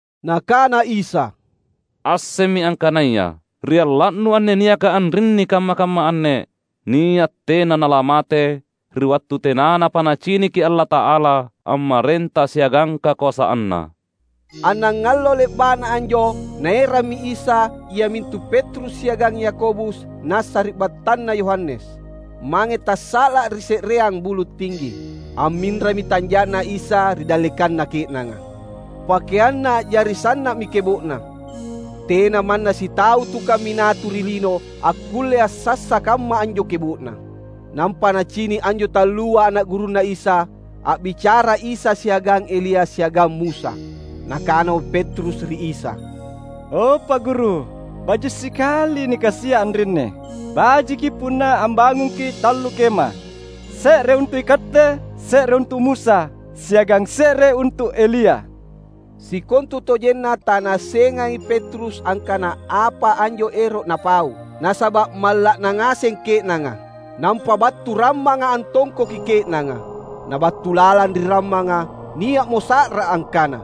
Nakana Isa, "Assemmi angkanaya, ri alla’nu anne niaka anrinni kamma-kamma anne, nia’ tena nalamate, ri wattu tenanapa naciniki Allata’ala ammarenta siagang kakoasanNa!" Annangallo le’ba’na anjo Naerammi Isa iamintu Petrus siagang Yakobus na sari’battanna Yohanes, mange tassa’la’ ri se’reang bulu’ tinggi. Amminrami tanja’Na Isa ri dallekanna ke’nanga. PakeanNa a’jari sanna’mi kebo’na. Tena manna sitau tukang minatu ri lino akkulle assassa kamma anjo kebo’na. Nampa nacini’ anjo tallua ana’ gurunNa Isa, a’bicara Isa siagang Elia siagang Musa. Nakanamo Petrus ri Isa, "O Pa’ Guru, baji’ sikali nikasia’ anrinni. Bajiki punna ambangungki’ tallu kema: se’re untu’ iKatte, se’re untu’ Musa, siagang se’re untu’ Elia." Sikontutojenna tanaassengai Petrus angkana apa anjo ero’ napau, nasaba’ malla’na ngaseng ke’nanga. Nampa battu rammanga antongkoki ke’nanga. Na battu lalang ri rammanga, nia’mo sa’ra angkana,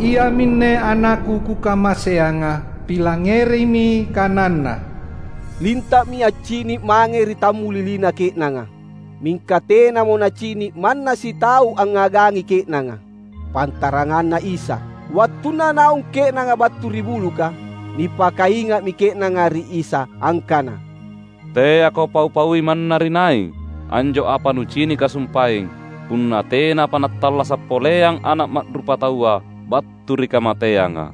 "Iaminne AnakKu Kukamaseanga. Pilangngerimi kananNa!" Linta’mi accini’ mange ri tammulilina ke’nanga. Mingka tenamo nacini’ manna sitau angngagangi ke’nanga, pantaranganna Isa. Wattunna naung ke’nanga battu ri buluka, nipakainga’mi ke’nanga ri Isa angkana, "Teako pau-paui manna ri nai, anjo apa nucinika sumpaeng, punna tenapa nattallasa’ poleang Ana’ Ma’rupataua battu ri kamateanga."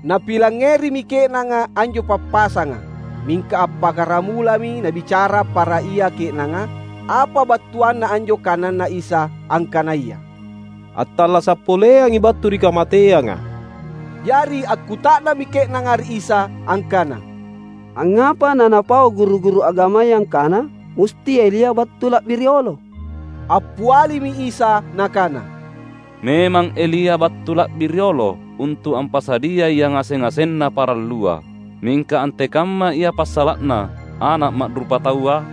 Napilangngerimi ke’nanga anjo pappasanga. Mingka appakkaramulami nabicara para ia ke’nanga apa battuanna anjo kananNa Isa angkanaya, "attallasa’ poleangi battu ri kamateanga." Jari akkuta’nammi ke’nanga ri Isa angkana, "Angngapa na napau guru-guru agamaya angkana, musti Elia battu la’bi riolo?" Appialimi Isa Nakana, "Memang Elia battu la’bi riolo untu’ ampasadiai yangaseng-ngasenna parallua. Mingka antekamma ia passala’na Ana’ Ma’rupataua?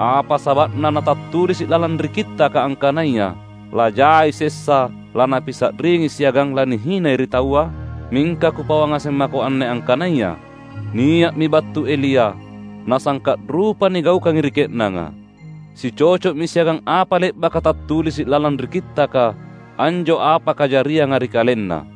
Apa saba’na na tattulisi’ lalang ri Kittaka angkanaya lajai sessa laNapisa’ringi siagang lanihinai ri taua? Mingka Kupauang ngaseng mako anne angkanaya: Nia’mi battu Elia, nasangka’ rupa nigaukangi ri ke’nanga. Sicoco’mi siagang apa le’baka tattulisi’ lalang ri Kittaka anjo apa kajarianga ri kalenna."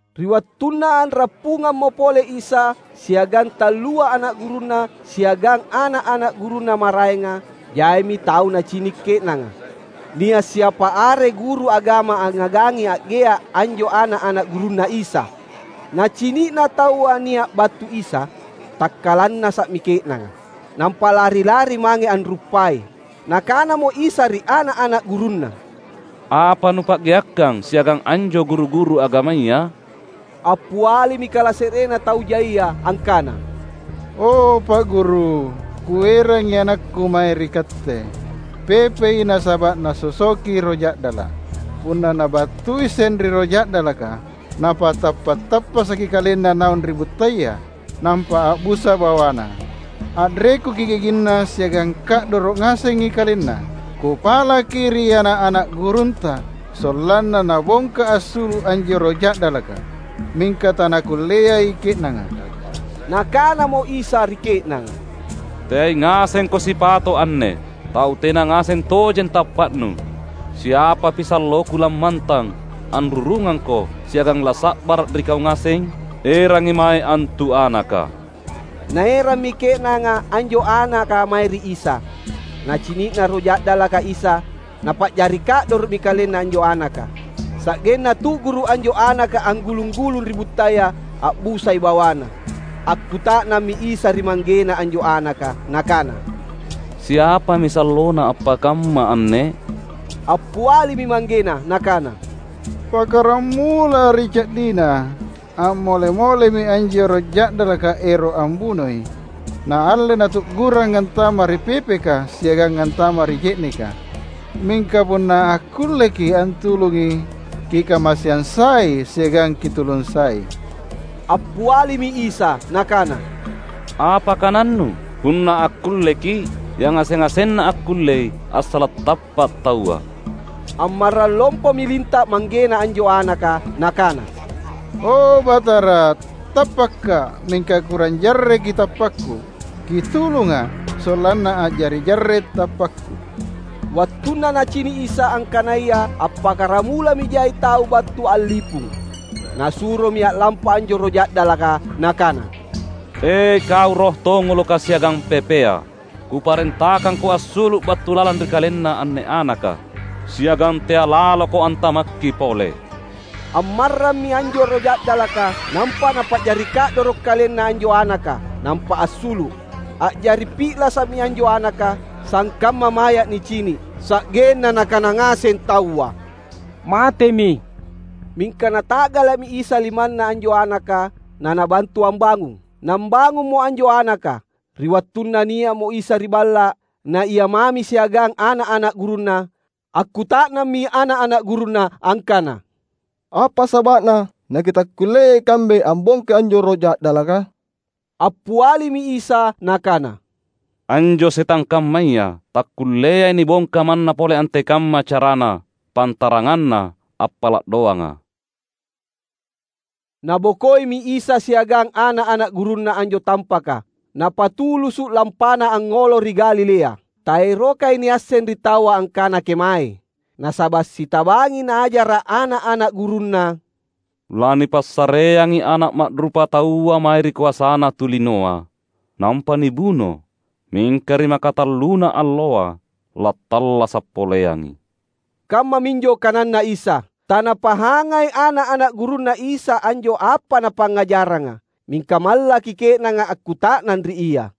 Ri wattunna a’rappungammo pole Isa siagang tallua ana’ gurunNa siagang ana’-ana’ gurunNa maraenga, jaimi tau nacini’ ke’nanga. Nia’ siapa are guru agama angngagangi a’gea’ anjo ana’-ana’ gurunNa Isa. Nacini’na taua nia’ battu Isa, takkalannasa’mi ke’nanga, nampa lari-lari mange anruppai. Nakanamo Isa ri ana’-ana’ gurunNa, "Apa nupa’geakkang siagang anjo guru-guru agamaya?" Appialimi kalase’renna tau jaia angkana, "O Pa’ Guru, kuerangi anakku mae ri Katte. Pepei nasaba’ nasosoki roh ja’dala’. Punna nibattuiseng ri roh ja’dalaka, napatappa’-tappasaki kalenna naung ri buttaya, nampa a’busa bawana, a’rekuki giginna siagang ka’doro’ ngasengi kalenna. Kupalaki ri ana’-ana’ gurunTa sollanna nabongka assulu’ anjo roh ja’dalaka, mingka tanakulleai ke’nanga." Nakanamo Isa ri ke’nanga, "Teai ngasengko sipato’ anne! Tau tena ngaseng tojeng tappa’nu. Siapapi salloKu lammantang anrurungangko siagang lasa’bara’ ri kau ngaseng? Erangi mae antu anaka!" Naerammi ke’nanga anjo anaka mae ri Isa. Nacini’na roh ja’dalaka Isa, napa’jari ka’doro’mi kalenna anjo anaka, sa’genna tu’guru’ anjo anaka anggulung-gulung ri buttaya. A’busai bawana. Akkuta’nammi Isa ri manggena anjo anaka nakana, "Siapami sallona appakamma anne?" Appialimi manggena nakana, "Pakkaramula ri ca’dina! A’mole-molemi anjo roh ja’dalaka ero’ ambunoi, naalle natu’gurang antama’ ri pepeka siagang antama’ ri je’neka. Mingka punna akkulleKi’ antulungi, Kikamaseang sai siagang Kitulung sai!" Appialimi Isa Nakana, "Apa kanannu? Punna akkulleKi’? Yangaseng-ngasenna akkullei, assala’ tappa’ taua!" Ammarrang lompomi linta’ manggena anjo anaka, nakana, "O Batara, tappakka’, mingka kurang jarreki tappakku. Kitulunga’ sollanna a’jari jarre’ tappakku!" Wattunna Nacini’ Isa, angkanaya appakkaramulami jai tau battu a’lipung, Nasuromi a’lampa anjo roh ja’dalaka. Nakana, "E kau roh tongoloka siagang pepea, Kuparentakangko assulu’ battu lalang ri kalenna anne anaka, siagang tea’ laloko antamakki pole!" Ammarrammi anjo roh ja’dalaka, nampa napa’jari ka’doro’ kalenna anjo anaka, nampa assulu’. A’jari pi’lasa’mi anjo anaka, sangkamma maya’ nicini’, sa’genna nakana ngaseng taua, "Matemi!" Mingka Nata’gala’mi Isa limanna anjo anaka, na Nabantu ambangung. Nambangummo anjo anaka. Ri wattunna nia’mo Isa ri balla’, na Ia mami siagang ana’-ana’ gurunNa, akkuta’nammi ana’-ana’ gurunNa angkana, "Apa saba’na nakitakkullea ikambe ambongkai anjo roh ja’dalaka?" Appialimi Isa Nakana, "Anjo setang kammaya takkulleai nibongka manna pole antekamma carana, pantaranganna appala’ doanga." Nabokoimi Isa siagang ana’-ana’ gurunNa anjo tampaka, napatulusu’ lampana angngolo ri Galilea. Taerokai niasseng ri taua angkana kemaei, nasaba’ sitabangi Naajara’ ana’-ana’ gurunNa, "Lanipassareangi Ana’ Ma’rupataua mae ri koasana tu linoa, nampa nibuno; mingka ri makatalluna alloa lattallasa’ poleangi!" Kammaminjo kananNa Isa. Tanapahangai ana’-ana’ gurunNa Isa anjo apa Napangngajaranga, mingka mallaki ke’nanga akkuta’nang ri Ia.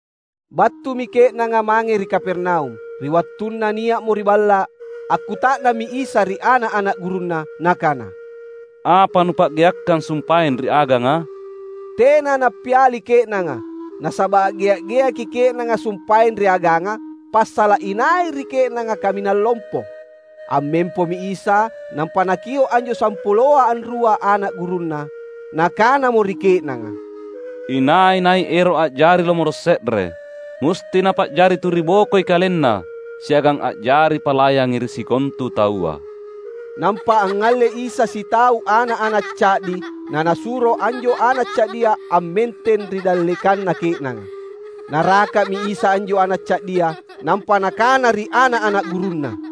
Battumi ke’nanga mange ri Kapernaum. Ri wattunna nia’mo ri balla’, akkuta’nammi Isa ri ana’-ana’ gurunNa Nakana, "Apa nupa’geakkang sumpaeng ri aganga?" Tena nappiali ke’nanga. Nasaba’ a’gea’-geaki ke’nanga sumpaeng ri aganga passala’ inai ri ke’nanga kaminang lompo. Ammempomi Isa nampa Nakio’ anjo sampuloa anrua ana’ gurunNa. Nakanamo ri ke’nanga, "Inai-nai ero’ a’jari lomoro’ se’re, musti napa’jari tu ri bokoi kalenna siagang a’jari palayangi ri sikontu taua." Nampa angngalle Isa sitau ana’-ana’ ca’di naNasuro anjo ana’ ca’dia ammenteng ri dallekanna ke’nanga. Naraka’mi Isa anjo ana’ ca’dia nampa Nakana ri ana’-ana’ gurunNa,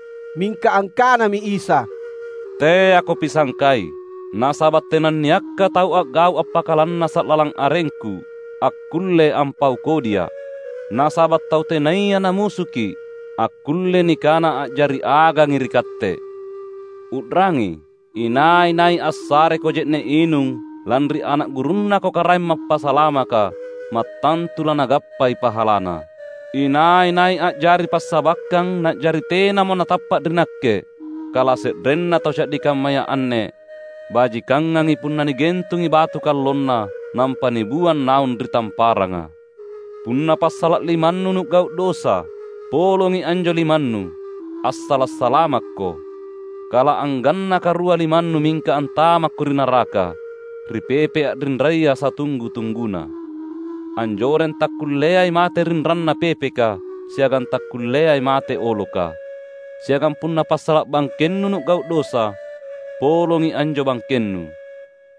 Mingka angkanami Isa, "Teako pisangkai. Nasaba’ tenanniakka tau a’gau’ appakalannasa’ lalang arengKu, akkulle ampau kodiA’. Nasaba’ tau tenaya namusuki’, akkulle nikana a’jari agangi ri katte. U’rangi! Inai-nai assareko je’ne’ inung lanri ana’ gurunnako Karaeng Mappasalamaka, mattantu lanagappai pahalana." "Inai-nai a’jari passabakkang na’jari tenamo natappa’ ri Nakke kalase’renna tau ca’di kammaya anne, bajikangangi punna nigentungi batu kallonna nampa nibuang naung ri tamparanga. Punna passala’ limannu nu’gau’ dosa, polongi anjo limannu assala’ salamakko, kala anggannaka rua limannu mingka antamakko ri naraka, ri pepe’ a’rinraya satunggu-tungguna. [Anjoreng takkulleai mate rinrana pepeka, siagang takkulleai mate oloka.] Siagang punna passala’ bangkennu nu’gau’ dosa, polongi anjo bangkennu.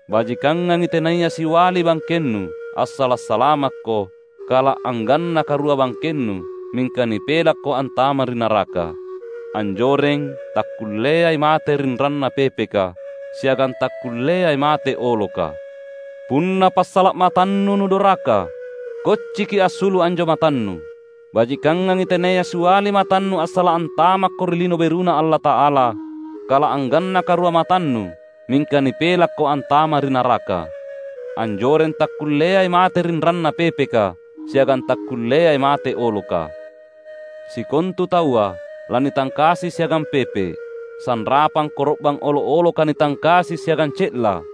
Bajikangangi tenaya siali bangkennu assala’ salamakko, kala anggannaka rua bangkennu mingka nipelakko antama’ ri naraka. [Anjoreng takkulleai mate rinrana pepeka, siagang takkulleai mate oloka.] Punna passala’ matannu nudoraka, kocciki assulu’ anjo matannu! Bajikangangi tenaya siali matannu assala’ antamakko ri Lino BeruNa Allata’ala, kala anggannaka rua matannu mingka nipelakko antama’ ri naraka. Anjoreng takkulleai mate rinrana pepeka, siagang takkulleai mate oloka. Sikontu taua lanitangkasi siagang pepe’, sanrapang koro’bang olo’-oloka nitangkasi siagang ce’la.